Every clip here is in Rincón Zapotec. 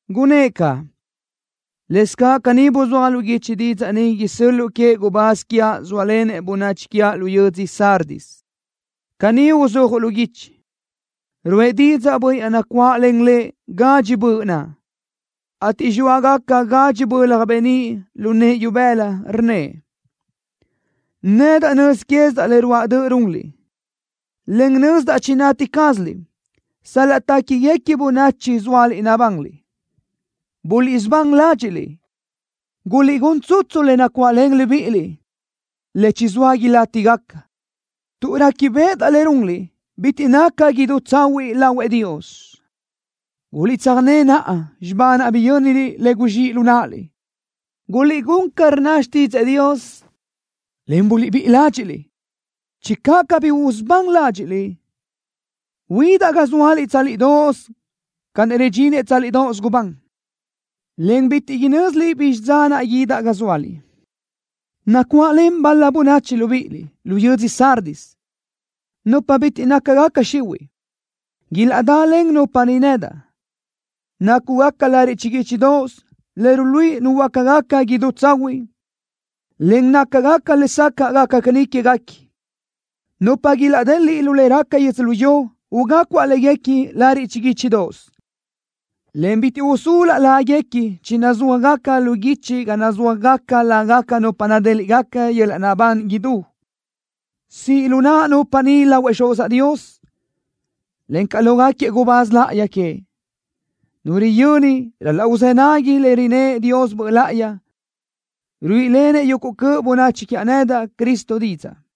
Gunnë́ʼ caʼ: “Lëscaʼ caní buzúaj lu guichi didzaʼ ni isö́l-luʼu queëʼ gubáz quiaʼ zóalenëʼ bönachi quiaʼ lu yödzö Sardis. Caní uzúajuʼ lu guichi: Ruʼë didzaʼ Bönniʼ naʼ nacuáʼlen Lëʼ gadxi böʼ naʼ, ateʼ zxóagacabaʼ gadxi bölaj beníʼ lu nëʼë ibëla, rnnëʼ: Nedaʼ nöz quézidaʼ le ruáʼ döʼ runliʼ, en nözdaʼ chinati cázaliʼ sal-laʼ téquiguequi bönachi zóaliʼ nabanliʼ. Buliʼsubán ládxiʼliʼ. Guliʼgún tsutsu le nacuáʼlen libíʼiliʼ, le chizóa ilátigaca, tuʼ réquibeʼedaʼ le runliʼ bitiʼ naca idú tsahuiʼ lahuëʼ Dios. Guliʼtsöjné naʼa xibá naʼ biyö́niliʼ le guzxíʼ lu náʼaliʼ. Guliʼgún ca rnna xtídzëʼë Dios, en buliʼbíʼi ládxiʼliʼ. Channö cabí usubán ládxiʼliʼ, guídaʼ ga zóaliʼ tsálidoʼos ca naʼ ridxinëʼ tsálidoʼos gubán, en bitiʼ inö́ziliʼ bizxi dza naʼ guídaʼ ga zóaliʼ. Nacuáʼlen bal-la bönachi libíʼiliʼ lu yödzö Sardis, nupa bitiʼ nácagaca xihuiʼ. Ilaʼdalen nupa ni nedaʼ, nácugaca lariʼ chiguíchidoʼos le ruluíʼi nuhuöácagaca idú tsahuiʼ, en nácagaca lesacaʼ gaca caní quéguequi. Nupa ilaʼdeliʼ lu le raca yödzölió ugácuaʼ léguequi lariʼ chiguíchidoʼos, en bitiʼ usúluaʼ láguequi chinazúajgaca lu guichi ga nazúajgaca lágaca nupa nadéliʼgaca yöl-laʼ naʼbán idú. Siʼ lu naʼa nupa ni lahuëʼ Xuzaʼ Dios, encaʼ lógaquiëʼ gubáz láʼayi queëʼ. Nu riyöni ral-laʼ uzë́ nagui lë ni rnnëʼ Dios Böʼ Láʼayi, ruíʼilenëʼ yuguʼ cöʼ bönachi quiaʼ nedaʼ, Cristo, didzaʼ.”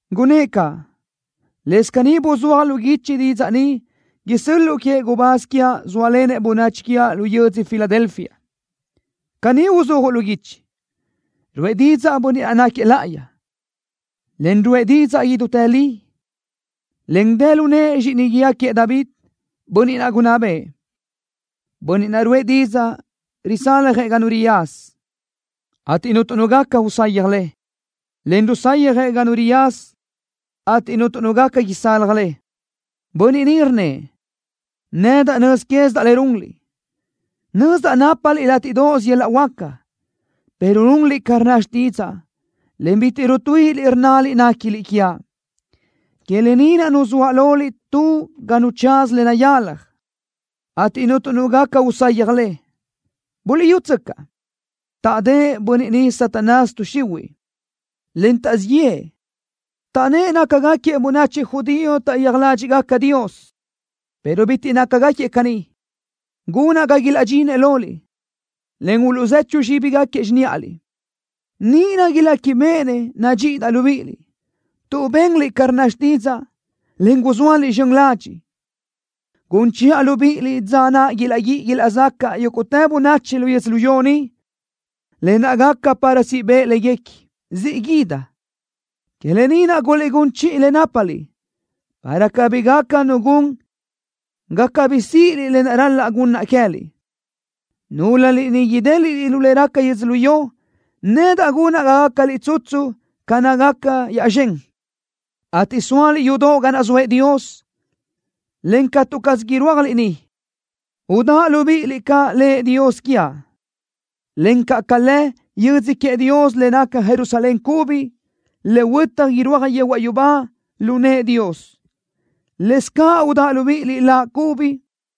Gunnë́ʼ caʼ: “Lëscaʼ caní buzúaj lu guichi didzaʼ ni isö́l-luʼu queëʼ gubáz quiaʼ zóalenëʼ bönachi quiaʼ lu yödzö Filadelfia. Caní uzúajuʼ lu guichi: Ruʼë didzaʼ Bönniʼ naʼ náquiëʼ láʼayi, en ruʼë didzaʼ idútë li, en dë lu nëʼë zxíʼini guíë queëʼ David, bönniʼ gunná bëʼë. Bönniʼ naʼ ruʼë didzaʼ risálajëʼ ga nu riyaza, ateʼ cuntu nu gaca usayaj le, en rusayjëʼ ga nu riyaza, ateʼ cuntu nu gaca isalaj le. Bönniʼ ni rnnëʼ: Nedaʼ nöz quézidaʼ le runliʼ. Nözdaʼ nápaliʼ látiʼdoʼos yöl-laʼ huáca, pero runliʼ ca rnna xtídzaʼa, en bitiʼ rutuíʼiliʼ rnnaliʼ néquiliʼ quiaʼ. Que lë ni naʼ nuzóaʼ loliʼ tu ga nu tsaz le nayalaj, ateʼ cuntu nu gaca usayaj le. Buliʼyútsöcaʼ, taʼdë́ʼ bönniʼ niʼ Satanás, tuʼ xihuiʼ, en taʼzíʼ yëʼë, taʼnnë́ʼ nácagaquiëʼ bönachi judío taʼyéaj ládxiʼgaca Dios, pero bitiʼ nácagaquiëʼ caní, gunaʼ ga ilaʼdxinëʼ loliʼ, en uluʼzechu zxíbigaquiëʼ xiníʼaliʼ. Níʼirö iléquibeʼenëʼ nadxíʼidaʼ libíʼiliʼ. Tuʼ benliʼ ca rnna xtídzaʼa, en gulö́zaliʼ zxön ladxiʼ, gun chiʼa libíʼiliʼ dza naʼ ilaʼguíʼi ilaʼzacaʼ yúguʼtë bönachi lu yödzölió ni, lë naʼ gaca para siʼ bëʼ léguequi. ¡Siʼ guídaʼ! Que lë ni naʼ guliʼgún chiʼi le nápaliʼ, para cabí gaca nu gun ga cabí síʼiliʼ lë naʼ ral-laʼ gunnaʼ queë́liʼ. Núlöliʼ niʼ idélaʼliʼ lu le raca yödzölió, nedaʼ gunaʼ ga gácaliʼ tsutsu ca nácagaca yaʼzxö́n, ateʼ sóaliʼ yudoʼ ga naʼ zoëʼ Dios, en catu caz irúajliʼ niʼ. Udáʼa libíʼiliʼ ca lëʼ Dios quiaʼ, encaʼ ca lë yödzö queëʼ Dios le naca Jerusalén cubi, le huötaj irúaj yehuaʼ yubá lu nëʼë Dios. Lëscaʼ udáʼa libíʼiliʼ Laʼ cubi.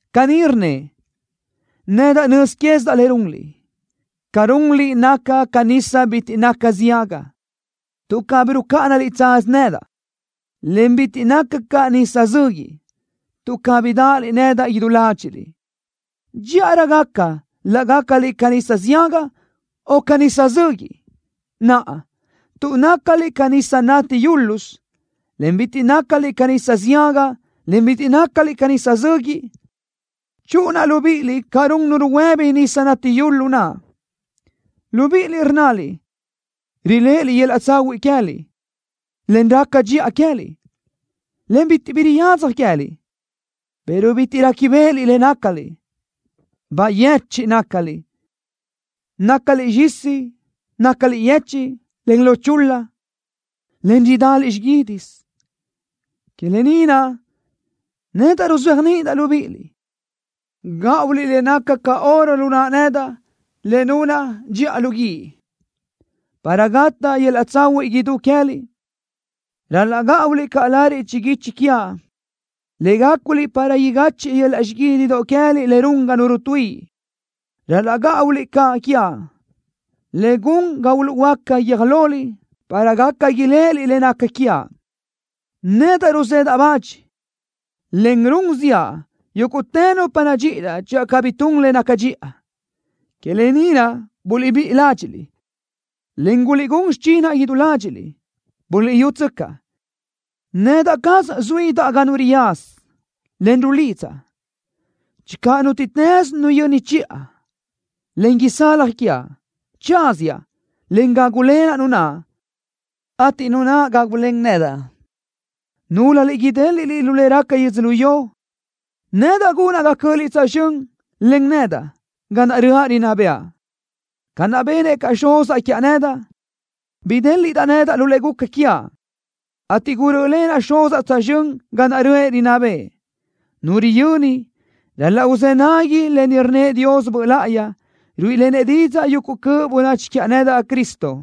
Caní rnnëʼ: Nedaʼ nöz quézidaʼ le runliʼ. Ca runliʼ naca ca nisa bitiʼ naca ziaga, tuʼ cabí rucáʼanaliʼ tsaz nedaʼ, en bitiʼ naca ca nisa zöguiʼ, tuʼ cabí dáʼaliʼ nedaʼ idú ládxiʼliʼ. Dxíʼarö gaca laʼ gácaliʼ ca nisa ziaga o ca nisa zöguiʼ. Naʼa, tuʼ nácaliʼ ca nisa nati yúlasö, en bitiʼ nácaliʼ ca nisa ziaga, en bitiʼ nácaliʼ ca nisa zöguiʼ, chúʼunaʼ libíʼiliʼ ca run nu ruhuë́bi nisa nati yula naʼ. Libíʼiliʼ rnnaliʼ riléʼeliʼ yöl-laʼ tsahuiʼ queë́liʼ, en raca dxiʼa queë́liʼ, en bitiʼ bi riyadzaj queë́liʼ, pero bitiʼ réquibeʼeliʼ le nácaliʼ. ¡Bayechiʼ nácaliʼ! ¡Nácaliʼ xizíʼ! ¡Nácaliʼ yechiʼ, en lo chul-la, en ridaliʼ xiguídisö! Que lë ni naʼ, nedaʼ ruzéajniʼidaʼ libíʼiliʼ gáʼuliʼ le naca ca oro lu naʼa nedaʼ le nunaʼ dxiʼa lu guíʼ, para gataʼ yöl-laʼ tsahuiʼ idú queë́liʼ. Ral-laʼ gáʼuliʼ caʼ lariʼ chiguichi quiaʼ le gáculiʼ para igachiʼ yöl-laʼ xiguídidö queë́liʼ le run ga nu rutuíʼi. Ral-laʼ gáʼuliʼ caʼ quiaʼ le gun ga uluʼhuöáca guiö́j loliʼ para gaca iléʼeliʼ le naca quiaʼ. Nedaʼ ruzedaʼ bach, en run ziʼa yúguʼtë nupa nadxíʼidaʼ channö cabí tun le naca dxiʼa. Que lë ni naʼ, buliʼbíʼi ládxiʼliʼ, en guliʼgún xichinaʼ idú ládxiʼliʼ. Buliʼyútsöcaʼ, nedaʼ caz zuínaʼ ga nu riyaza, en rulidzaʼ. Channö nútiʼtës nu yöni chiʼa, en isalaj quiaʼ, tsáziaʼ, en gágulenaʼ nu naʼ, ateʼ nu naʼ gágulen nedaʼ. Núlöliʼ idéliʼliʼ lu le raca yödzölió, nedaʼ gunaʼ ga cö́ʼöliʼ tsözxö́n len nedaʼ ga naʼ röʼa rinná bëʼa, ca naʼ benëʼ caʼ Xuzaʼ quiaʼ nedaʼ. Bidéliʼdaʼ nedaʼ lu le guca quiaʼ, ateʼ gurö́ʼlenaʼ Xuzaʼ tsözxö́n ga naʼ röʼë rinná bëʼë. Nu riyöni, ral-laʼ uzë́ nagui lë ni rnnëʼ Dios Böʼ Láʼayi, ruíʼilenëʼ didzaʼ yuguʼ cöʼ bönachi quiaʼ nedaʼ, Cristo.”